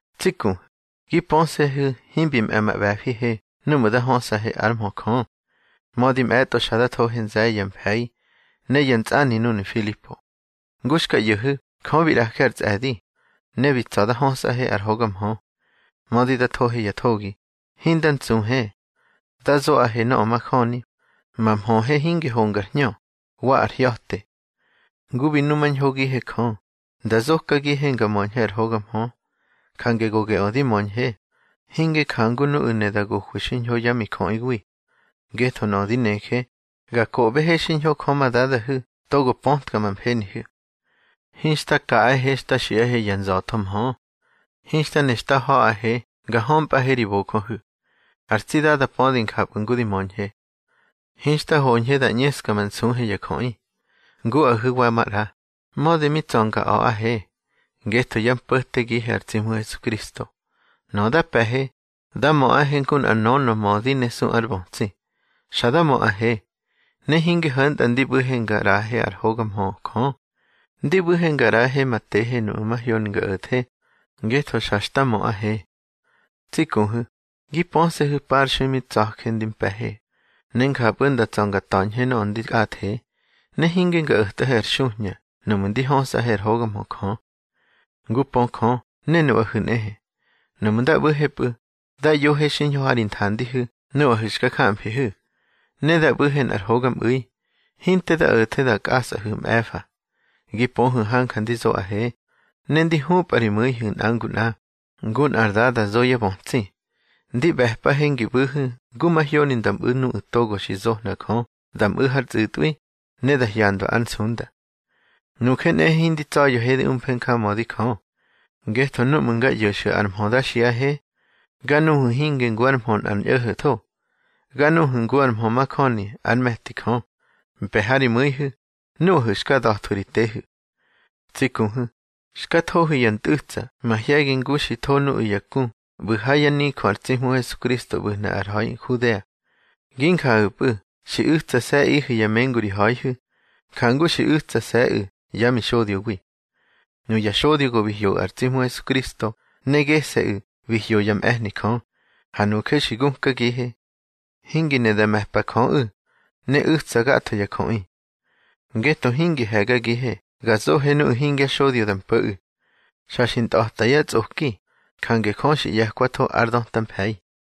Tsi kuhu̱, gi pöse̱hu̱ himbi mꞌe̱ ma ꞌbe̱fihe núꞌmu̱ nda hösꞌahe ár mhö Jö. Mödi mꞌe̱tꞌo xa da thohe nze̱ye̱ ya mfe̱i ne ya ntsꞌani núnu̱ Nfilipo, ngu xka ꞌyo̱hu̱, Jö bi ꞌraje ar tsꞌe̱di, ne bi tsa̱ da hösꞌahe ár hoga mhö. Mödi da thohe ya thogi, hinda ntsuhe. Da zoꞌahe nöꞌö majöni. Ma mhöhe hinge hongar hñö, wa ar hya̱te. Ngu bi numañhogihe Jö nda zokagihe nga möñhe ar hoga mhö, jange go geꞌö di möñhe, hinge njangu nuꞌu̱ ne da gohwi xiñho yá mijöꞌiwi. Ngetho nöꞌö di neje, ga koꞌbehe xiñho Jö ma Dadahu̱ togo pötka ma mfenihu̱. Hinxta kaꞌahe xta xiꞌahe ya nza̱tho mhö. Hinxta ne xta ha̱ꞌahe nga hömpꞌahe ri bojöhu̱. Ar tsi Dada pödi njapꞌu̱ ngu di möñhe. Hinxta hoñhe da ꞌñeska ma nsuhe ya jöꞌi, nguꞌahu̱ wa maꞌra, mödi mi tsa̱ nga a̱ꞌahe, ngetho yá mpo̱tegihe ar tsi Hmu Hesukristo. Nöꞌö da pe̱he, da möꞌahe ngu nꞌar nönö mödi ne su ár bötsi. Xa da möꞌahe. Ne hinge ho̱ntꞌa ndi ꞌbu̱he nga ꞌraꞌahe ár hoga mhö Jö; ndi ꞌbu̱he nga ꞌraꞌahe ma tehe nuꞌmu̱ mahyoni nga o̱the, ngetho xa xta möꞌahe. Tsi kuhu̱, gi pöse̱hu̱ parxui mi tsa̱je ndi mpe̱he, ne njapꞌu̱ nda tsa̱ nga ta̱ñhe nöꞌö ndi kꞌathe. Ne hinge nga o̱tꞌahe ar xuhña núꞌmu̱ ndi hösꞌahe ár hoga mhö Jö. Ngu pö Jö ne nuꞌahu̱ nꞌehe, núꞌmu̱ nda ꞌbu̱hepꞌu̱, da ꞌyohe xiñho ha ri nthandihu̱ nuꞌahu̱ xka jamfihu̱. Ne da ꞌbu̱he nꞌar hogamꞌu̱i, hinte da o̱the nda kꞌasꞌahu̱ mꞌe̱fa. Gi pöhu̱ hanja ndi zoꞌahe, ne ndi hupꞌa ri mu̱ihu̱ nꞌa ngu nꞌa, ngu nꞌar dada zo yá bötsi. Ndi ꞌbe̱pꞌahe ngi ꞌbu̱hu̱ ngu mahyoni da mꞌu̱ nuꞌu̱ togo xi zohna Jö da mꞌu̱ hár tsꞌu̱tꞌwi, ne da hyandwa ár nsunda. Nuje nꞌehe hindi tsa̱ya̱he di umfe njamödi Jö, ngetho núꞌmu̱ nga ꞌyo̱xu̱ ar mhö da xiꞌahe, ga nuhu̱ hinge ngu ár mhö nꞌar ñꞌo̱ho̱tho. Ga nuhu̱ ngu ar mhö majöni ár me̱ti Jö, mpe̱ ha ri mu̱ihu̱, nuꞌahu̱ xka da̱thwu̱ ri tehu̱. Tsi kuhu̱, xka thohu̱ ya ntꞌu̱tsa mahye̱gi ngu xi tho nuꞌu̱ ya ku ꞌbu̱ ha yá nijö ar tsi Hmu Hesukristo ꞌbu̱hnu̱ har ha̱i Nhudea. Gi njahu̱pꞌu̱ xi u̱tsase̱ꞌihu̱ ya mengu ri ha̱ihu̱, njangu xi u̱tsase̱ꞌu̱ yá mixodyowi. Nuya xodyo go bi hyoꞌu̱ ar tsi Hmu Hesukristo, ne gese̱ꞌu̱ bi hyo yá mꞌe̱hni Jö, ha nuje bi gukagihe. Hingi ne da me̱pa Jöꞌu̱, ne u̱tsa gatho ya jöꞌi. Ngetho hingi he̱gagihe ga zohe nuꞌu̱ hingya xodyo da mpo̱ꞌu̱. Xa xi ntꞌa̱ta yá tsꞌoki, jange Jö xi ꞌye̱kwatho ár döta mfe̱i.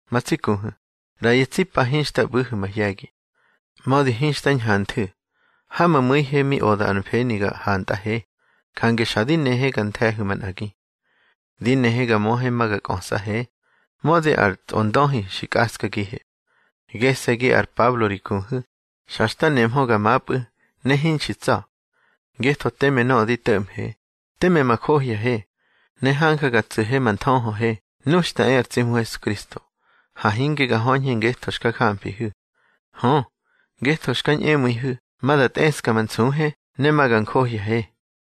Ma tsi kuhu̱, ꞌra ya tsi pa hinxta ꞌbu̱hu̱ mahye̱gi. Mödi hinxta ñhanthu̱, ha ma mu̱ihe mi oda ar mfeni ga hantꞌahe, jange xa di nehe ga nthe̱hu̱ manꞌagi. Ndi nehe nga möhe ma nga kꞌösꞌahe, mödi ar Tsꞌondöhi xi kꞌaskagihe. Gese̱gi ar Pablo ri kuhu̱, xa xta nemhö ga mapꞌu̱, ne hinxi tsa̱. Ngetho teme nöꞌö di to̱ꞌmhe, teme ma johyahe, ne hanja ga tsu̱he ma nthöhöhe nu xta e ar tsi Hmu Hesukristo. Ha hinge ga höñhe ngetho xka jamfihu̱. Hö, ngetho xka ñꞌemu̱ihu̱ ma da tꞌeska ma nsuhe ne ma ga njohyahe.